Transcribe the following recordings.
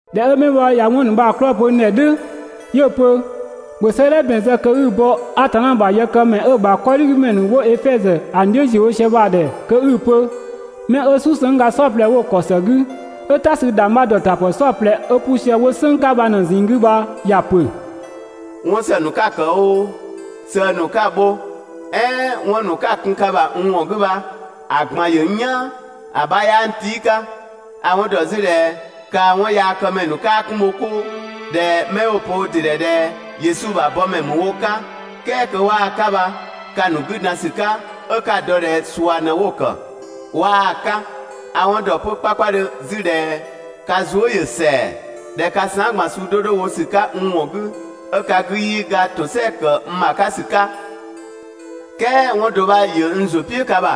꞊Dhɛ 'ö 'mɛ bha ꞊ya 'wɔn ‑nu bha‑ ‑nu 'klɔɔ‑ pö n ‑dhɛ "dhʋ̈, 'yö‑ pö: «‑Bhö 'sëëdhɛ ‑bɛn zë kö 'i‑ bɔ Atanna ‑bha yëkëmɛ 'ö‑ ‑bha 'kɔdhigümɛ ‑nu 'wo Efɛzö ‑a ‑nu "dhiʋ̈ ‑ziö wo sië bha‑ ‑dhɛ kö 'i‑ pö: 'Mɛ 'ö "susëngga "saɔplɛ 'wo‑ ‑kɔ ‑së 'gü, 'ö "ta sü ‑dhangbha ‑dɔtapë "saɔplɛ 'ö 'pu sië 'wo "sënng 'ka bha ꞊në‑ ꞊zinng 'gü bha ‑ya ‑pö: «'Wɔn ‑së ‑nu 'ka‑ ‑kë oo, sëë ‑nu 'ka‑ bho, "ɛɛn 'wɔn ‑nu 'ka‑ kun ka ‑bha n ‑wɔn 'gü bha‑ ꞊gban ‑yö n "yaan. ‑A 'bha 'yaa n tii' 'ka. A‑ 'wɔn ‑dɔ 'zü ꞊dhɛ kaa 'wɔnyaakëmɛ ‑nu 'kaa 'kun bho 'koo, ꞊dhɛ 'mɛ 'wo‑ pö wo ‑dɩ ‑dhɛ ꞊dhɛ Yesu ‑bha bɔmɛ ‑mü wo 'ka, "kɛɛ kö 'waa‑ 'ka bha ka‑ ‑nu 'gü dan ‑sü 'ka 'ö 'ka‑ dɔ ꞊dhɛ ꞊sua ꞊në 'wo‑ ‑kë, 'waa‑ 'ka. A‑ 'wɔn ‑dɔ 'kpakpadhö 'zü ꞊dhɛ ka zuë" ‑yö ‑sɛa, ꞊dhɛ ka saan" ꞊gban suu 'do 'do wo ‑sü 'ka n ‑wɔn 'gü, 'ö ka 'gü 'yii ga ‑tosɛa ‑kë n ‑bha 'ka ‑sü 'ka, "kɛɛ 'wɔn do 'bha ‑yö n ‑zʋ "piʋ̈ ka ‑bha: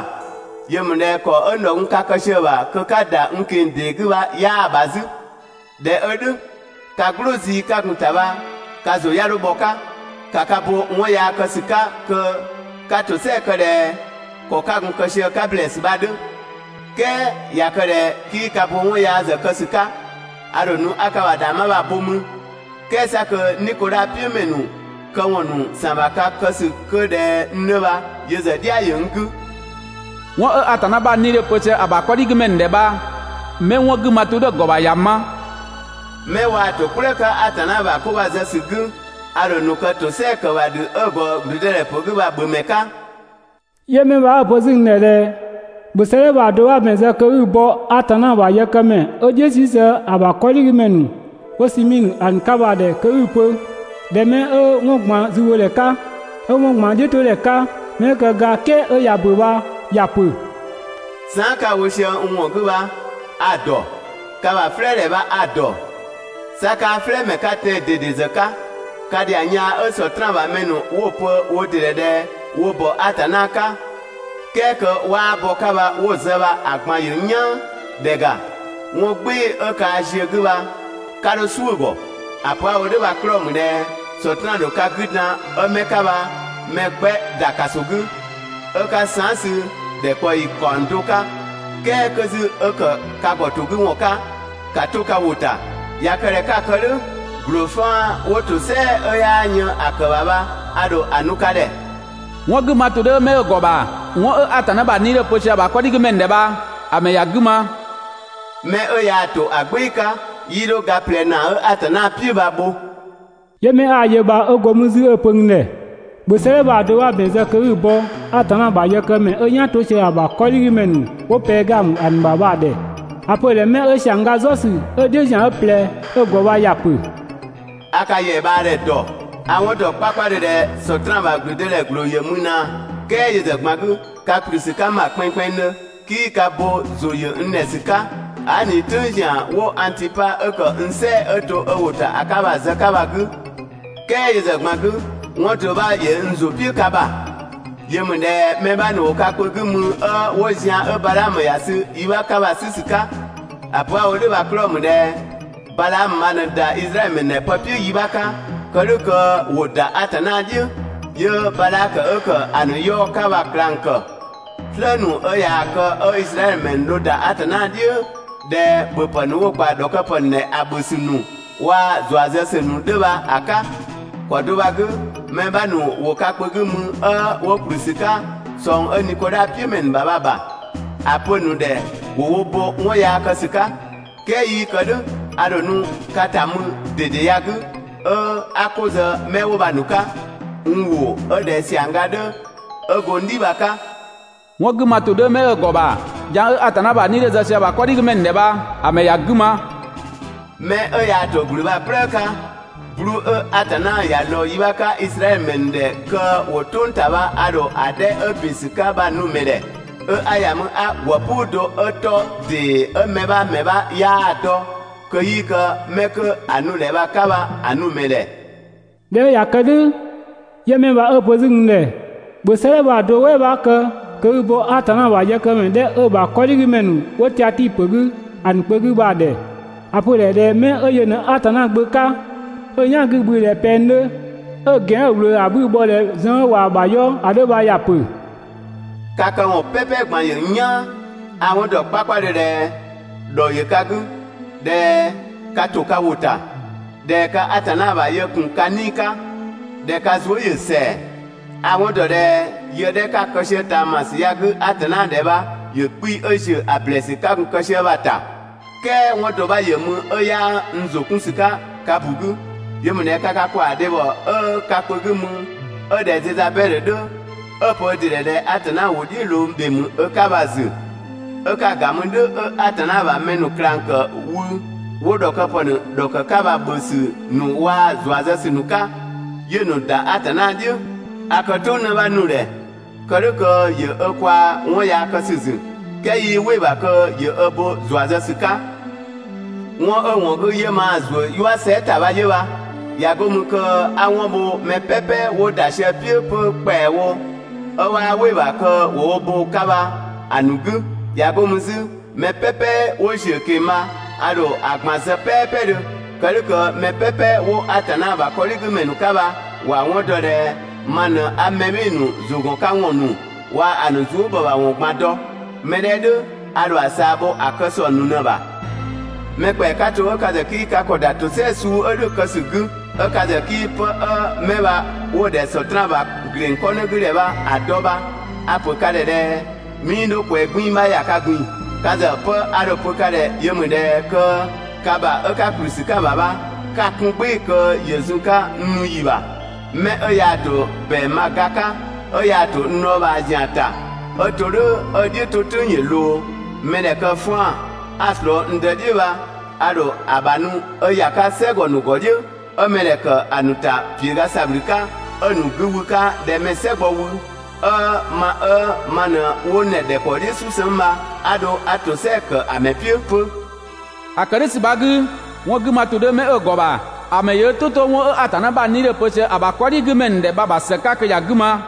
Yö ‑mü ꞊dhɛ ‑kɔ 'ö n ‑dhɔ gun 'ka ka kë sië‑ ‑bha kö 'ka ‑da n ꞊keng‑ ‑dee 'gü bha 'yaa‑ ‑bha 'zü. ꞊Dhɛ 'ö "dhʋ̈, ka "gblʋʋ zii 'ka gun‑ ‑ta bha ka ‑zʋ 'ya 'dho bhɔ‑ 'ka, ‑ka ka bo 'wɔn yaa kë ‑sü 'ka kö 'ka ‑tosɛa kë ꞊dhɛ ‑kɔ 'ka gun‑ kë sië‑ 'ka ‑blɛɛsü bha‑ 'dhö, "kɛɛ ꞊ya kë ꞊dhɛ 'kii ka bo 'wɔn yaa ‑zë kë ‑sü 'ka, a ‑dho nu 'a ka ‑bha ‑dhangbha bha‑ bho mü, "kɛɛ 'sa kö Nikodha "piʋ̈ ‑mɛ ‑nu këwɔn ‑nu ‑san ‑bha ka kë ‑sü 'kö ꞊dhɛ n 'dhö bha yö ‑zë "dhia ‑yö n 'gü. «'Wɔn 'ö Atanna ‑bha 'Nii‑ 'dhö‑ pö sië ‑a ‑bha 'kɔdhigümɛ ‑nu ‑dhɛ bha, 'mɛ 'wɔn 'gü ma ‑tʋ 'dhö‑ ‑gɔ ‑bha ‑mɛ ‑ya ma. 'Mɛ waa‑ ‑to "kplëë 'ka Atanna ‑bha 'ko bha‑ zë ‑sü 'gü, a ‑dho ‑nu kë ‑tosɛa ‑kë ‑bha ‑dhü 'ö‑ ‑gɔ ‑gblüdëdhɛpö 'gü bha‑ ‑bhö ‑mɛ 'ka.» 'Yö 'mɛ bha 'ö‑ pö 'zü n ꞊dhɛ ‑bhö 'sëëdhɛ bha‑ do 'bha ‑bɛn zë kö 'i‑ bɔ Atanna ‑bha yëkëmɛ 'ö "dhiʋ̈ 'sü sië ‑a ‑bha 'kɔdhigümɛ ‑nu 'wo Simiidhö ‑a ‑nu 'ka bha‑ ‑dhɛ kö 'i‑ pö ꞊dhɛ: «'Mɛ 'ö 'wɔn ꞊gban zübhodhɛ 'ka, 'ö 'wɔn ꞊gban "dhiʋ̈todhɛ 'ka, 'mɛ 'ö kë ga "kɛɛ 'ö ꞊ya ‑bö bha ‑ya pö: Saan" 'ka‑ wo sië n ‑wɔn 'gü bha a‑ ‑dɔ, ka ‑bha "flɛɛdhɛ bha a‑ ‑dɔ, 'sa 'kaa "flɛɛmɛ 'ka tɛan‑ ꞊dede ‑zë 'ka! Ka ‑dhiang yaa 'ö Sɔtraan ‑bha mɛ ‑nu 'wo‑ pö wo ‑dɩ ‑dhɛ ꞊dhɛ wo ‑bɔ Atanna 'ka "kɛɛ kö 'waa bɔ‑ 'ka bha 'wo‑ zë bha‑ ꞊gban ‑yö n "yaan! ‑Dhɛ ‑ga, 'wɔn "gbɩɩ‑ 'ö kaa ziö‑ 'gü bha 'ka 'dho "suʋ̈‑ ‑gɔ. ‑A pö 'a‑ wo "dhʋ̈ bha‑ 'klɔɔ‑ ‑mü ꞊dhɛ Sɔtraan ‑dho ka 'gü dan 'ö 'mɛ 'ka bha mɛ 'gbɛ ‑da ‑kaso 'gü, 'ö 'ka saan" sü ‑dhɛkpaɔyi ‑kaɔng do 'ka, "kɛɛ 'kö 'zü 'ö ‑kë ka ‑gɔtogüwɔn 'ka, ‑ka 'to ka ‑wʋ ‑ta. ꞊Ya kë ꞊dhɛ 'ka‑ kë "dhʋ̈, ‑gbloo 'faan‑ 'wo ‑tosɛa 'ö 'yaa yën ‑a ‑kë ‑bha bha a ‑dho ‑a nu ka ‑dhɛ. 'Wɔn 'gü ma ‑tʋ 'dhö 'mɛ 'ö‑ ‑gɔ ‑bha, 'wɔn 'ö Atanna ‑bha 'Nii‑ 'dhö‑ pö sië‑ ‑bha 'kɔdhigümɛ ‑nu ‑dhɛ bha‑ ‑mɛ ‑ya 'gü ma! 'Mɛ 'ö yaa‑ ‑to ‑a "gbɩɩ‑ 'ka, 'yii 'dho ga ꞊plɛ ‑naa 'ö Atanna "piʋ̈ bha‑ bho.» 'Yö 'mɛ 'a‑ yö bha 'ö go mü 'zü 'ö‑ pö n ‑dhɛ: «‑Bhö 'sëëdhɛ bha‑ do 'bha ‑bɛn zë kö 'i‑ bɔ Atanna ‑bha yëkëmɛ 'ö "yan 'to sië ‑a ‑bha 'kɔdhigümɛ ‑nu 'wo Pɛɛgamö ‑a ‑nu ‑bha bha‑ ‑dhɛ. ‑A pö‑ ‑dhɛ: «'Mɛ 'ö ‑siangga "zɔsü, 'ö‑ "dhiʋ̈ ‑zian 'ö ꞊plɛ bha 'ö‑ ‑gɔ bha ‑ya ‑pö: «A ka ‑yɛa ꞊bhaa ‑dhɛ ‑dɔ, a‑ 'wɔn ‑dɔ 'kpakpadhö ꞊dhɛ Sɔtraan ‑bha ‑blüdëdhɛ ‑gbloo ‑yö mü ꞊naa, "kɛɛ yö ‑zë ꞊gban 'gü ka ‑kplü ‑sü 'ka n ‑bha kpɛnngkpɛnngdhö, 'kii ka bo ‑zʋ ‑yö n ‑dhɛ ‑sü 'ka, aa" ꞊ni "tʋ̈ng ‑zian 'wo Angtipa 'ö ‑kë n "sɛɛ‑ 'ö to ö ‑wʋ ‑ta ‑a 'ka bha‑ zë‑ 'ka bha‑ 'gü. "Kɛɛ yö ‑zë ꞊gban 'gü, 'wɔn do 'bha ‑yö n ‑zʋ "piʋ̈ ka ‑bha. Yö ‑mü ꞊dhɛ mɛ 'bha ‑nu ‑wo ka kpö 'gü mü 'ö 'wo zian 'ö Badhaamö ‑ya sü yi 'bha 'ka bha‑ 'sü ‑sü 'ka. ‑A pö 'a‑ wo "dhʋ̈ bha‑ 'klɔɔ‑ ‑mü ꞊dhɛ Badhaamö bha ꞊në ‑da Izraɛdhö ‑mɛ ‑nu ‑dhɛ pë "piʋ̈ yi 'bha 'ka, kë "dhʋ̈ kö ‑wo ‑da Atanna "dhiʋ̈, 'yö Badhakö 'ö ‑kë ‑a ‑nu 'yaɔ‑ 'ka bha‑ ꞊klang ‑kë, "slë ‑nu 'ö ꞊yaa‑ kë 'ö Izraɛdhö ‑mɛ ‑nu dho ‑da Atanna "dhiʋ̈ ꞊dhɛ ‑bhöpë ‑nu 'wo‑ ‑kpa ‑dhɔkëpë ‑nu ‑dhɛ ‑a ‑bhö ‑sü ‑nu waa‑ ‑zua zë ‑sü ‑nu 'dhö bha‑ 'ka. ‑Kɔ do bha‑ 'gü mɛ 'bha ‑nu ‑wo ka kpö 'gü mü 'ö 'wo ‑kplü ‑sü 'ka ꞊sɔng 'ö Nikodha "piʋ̈ ‑mɛ ‑nu ‑bha bha‑ ‑bha. ‑A pö‑ ‑nu ‑dhɛ ‑wo wo bo 'wɔn yaa kë ‑sü 'ka. "Kɛɛ 'yii kë "dhʋ̈, a ‑dho nu ka ‑ta mü ‑dede ya‑ 'gü 'ö 'a 'ko zë 'mɛ 'wo bha‑ ‑nu 'ka (n ‑wʋ 'ö ꞊dhɛ) ‑siangga 'dhö 'ö go n "dhi bha‑ 'ka. 'Wɔn 'gü ma ‑tʋ 'dhö 'mɛ 'ö‑ ‑gɔ ‑bha, dhiang 'ö Atanna ‑bha 'nii‑ 'dhö‑ zë sië ‑a ‑bha 'kɔdhigümɛ ‑nu ‑dhɛ bha‑ ‑mɛ ‑ya 'gü ma! 'Mɛ 'ö yaa‑ ‑to ‑gblü bha‑ "kplëë 'ka, 'bluu‑ 'ö Atanna ‑ya lɔɔ yi 'bha 'ka Izraɛdhö ‑mɛ ‑nu ‑dhɛ kö ‑wo "tʋng ‑ta bha a ‑dho ‑a 'dhɛ 'ö ‑bin ‑sü 'ka bha‑ nu‑ ‑mɛ ‑dhɛ, 'ö 'a ‑ya mü 'a ‑gwë "puu do 'ö 'tɔ ‑dee 'ö mɛ 'bha ‑mɛ 'bha 'yaa‑ dɔ, kö 'yii kë mɛ 'kö 'a‑ nu‑ ‑dhɛ bha‑ 'ka bha‑ nu‑ ‑mɛ ‑dhɛ.» ꞊Dhɛ 'ö ꞊ya kë "dhʋ̈, 'yö 'mɛ bha 'ö‑ pö 'zü n ‑dhɛ: «‑Bhö 'sëëdhɛ bha‑ do "wɛɛ 'bha kë kö 'i‑ bɔ Atanna ‑bha yëkëmɛ 'dhɛ 'ö‑ ‑bha 'kɔdhigümɛ ‑nu 'wo Tiatii ‑pö 'gü ‑a ‑nu kpö 'gü bha‑ ‑dhɛ. ‑A pö‑ ‑dhɛ mɛ 'ö yö ꞊në Atanna Gbö 'ka, 'ö‑ "yan 'gü‑ bhü ꞊dhɛ pɛng 'dhö, 'ö‑ ‑gɛn 'ö‑ ꞊wlöö ‑a 'bhü‑ bhɔ ꞊dhɛ zën 'ö ꞊waa‑ ‑bha 'yɔ ‑a 'dhö bha ‑ya ‑pö: Ka këwɔn "pɛpɛ ꞊gban ‑yö n "yaan, a‑ 'wɔn dɔ 'kpakpadhö ꞊dhɛ ‑dhɔ ‑yö ka 'gü, ꞊dhɛ ka ‑to ka ‑wʋ ‑ta, ꞊dhɛ ka Atanna ‑bha yë ‑kun ka 'nii‑ 'ka, ꞊dhɛ ka zuë" ‑yö ‑sɛa. A‑ 'wɔn ‑dɔ ꞊dhɛ yë 'dhɛ 'ka‑ kë sië ꞊taamasü ya‑ 'gü Atanna ‑dhɛ bha ‑yö 'kpii‑ 'ö ‑ziö ‑a ‑blɛɛsü 'ka gun‑ kë sië bha‑ ‑ta. "Kɛɛ 'wɔn do 'bha ‑yö mü 'ö 'yaa n ‑zʋ 'kun ‑sü 'ka ka ‑bu 'gü. 'Yö ‑mü ꞊dhɛ ka ka ‑kwaa dhebhɔ 'ö ka kpö 'gü mü 'ö ꞊dhɛ Zezabɛdhö 'dhö, 'ö‑ pö ö ‑dɩ ‑dhɛ ꞊dhɛ Atanna ‑wʋ "dhiʋ̈ ꞊loo ‑dhe ‑mü ö 'ka bha‑ ‑zü, 'ö 'ka‑ ‑ga mü "dhʋ̈ 'ö Atanna ‑bha mɛ ‑nu ꞊klang ‑kë wü 'wo ‑dhɔkëpë ‑nu ‑dhɔkë 'ka bha‑ ‑bhö ‑sü ‑nu waa‑ ‑zua zë ‑sü ‑nu 'ka, 'yö‑ ‑nu ‑da Atanna "dhiʋ̈. A kë "tʋ̈ng 'në 'bha ‑nu ‑dhɛ kë "dhʋ̈ kö ‑yö ö kwaa‑ 'wɔn yaa kë ‑sü ‑zü "kɛɛ 'yii "wɩ‑ ‑bha kö ‑yö ö bo ‑zua zë ‑sü 'ka. 'Wɔn 'ö‑ ‑wɔn 'gü 'yö maa‑ ‑zuö "yua sɛɛ" ‑ta bha 'yö bha, ꞊ya 'go mü kö 'a 'wɔn bho mɛ "pɛpɛ 'wo ‑da sië‑ "piʋ̈ 'pö ‑kpɛawo 'ö 'waa "wɩ‑ ‑bha kö ‑wo wo bo‑ 'ka bha‑ ‑nu 'gü. ꞊Ya 'go mü 'zü, mɛ "pɛpɛ 'wo ‑ziö ꞊keng‑ bha a ‑dho ‑a ꞊gban zë "pɛɛpɛdhö, kë "dhʋ̈ kö mɛ "pɛpɛ 'wo Atanna ‑bha 'kɔdhigümɛ ‑nu 'ka bha ‑wa 'wɔn dɔ ꞊dhɛ ma ꞊në 'a mɛ "bhɩɩ‑ ‑nu ‑zʋgɔnkawɔn ‑nu waa‑ ‑a ‑nu zuëbhɔbhawɔn ꞊gban dɔ. 'Mɛ 'dhɛ "dhʋ̈ a ‑dho ‑a ꞊saa bho ‑a kë ‑sɔng ‑nu ꞊në‑ ‑bha. Mɛ ‑kpɛa 'ka to 'ö ka ‑zë 'kii ka ‑kɔ ‑da ‑tosɛa suu 'ö "dhʋ̈‑ kë ‑sü 'gü, 'ö ka ‑zë 'kii 'pë 'ö 'mɛ bha 'wo‑ ‑dhɛ Sɔtraan ‑bha ‑gleng 'kɔnë 'gü ‑dhɛ bha‑ dɔ bha a‑ ‑pö ka ‑dhɛ ꞊dhɛ 'mii 'dho ꞊kwɛɛ 'gbiin‑ 'bha ‑ya ka ꞊gbin‑. Ka ‑zë 'pë 'a dho‑ pö ka ‑dhɛ yö ‑mü ꞊dhɛ kö ka ‑bha 'ö 'ka ‑kplü ‑sü 'ka‑ ‑bha bha 'ka‑ 'kun "gbɩɩ‑ kö ‑yö zun‑ 'ka n nu ‑yi ‑bha. Mɛ 'ö yaa‑ ‑to ‑bɛang bha‑ ga 'ka, 'ö yaa‑ ‑to n dhɔɔbhaa ‑zian ‑ta 'ö to "dhʋ̈ 'ö‑ "dhiʋ̈ 'to "tʋ̈ng ‑yö ꞊loo, mɛdhɛ kë ‑faan 'a‑ ꞊slɔɔ n Dë "dhiʋ̈ bha a ‑dho ‑a ‑bha nu 'ö ‑ya 'ka "sɛgɔ ‑nu ‑gɔ "dhiʋ̈, 'ö mɛdhɛ ‑kë ‑a ‑nu ‑ta ‑piöga ‑sabhlü 'ka, 'ö‑ ‑nu 'gü wü‑ 'ka ꞊dhɛ mɛ‑ "sɛ gbɔ wü, 'ö ma 'ö ma ꞊në 'wo n ‑dhɛ ‑dhɛkpaɔ "dhiʋ̈ "susëng bha 'a dho 'a ‑tosɛa ‑kë ‑a ‑mɛ "piʋ̈ 'pö. ‑A ‑kë "dhʋ̈ ‑sü bha‑ 'gü, 'wɔn 'gü ma ‑tʋ 'dhö 'mɛ 'ö‑ ‑gɔ ‑bha, ‑a ‑mɛ ‑yö "tʋ 'to 'wɔn 'ö Atanna ‑bha 'Nii‑ 'dhö‑ pö sië ‑a ‑bha 'kɔdhigümɛ ‑nu ‑dhɛ bha‑ ‑bha ‑së 'ka kö ‑ya 'gü ma.»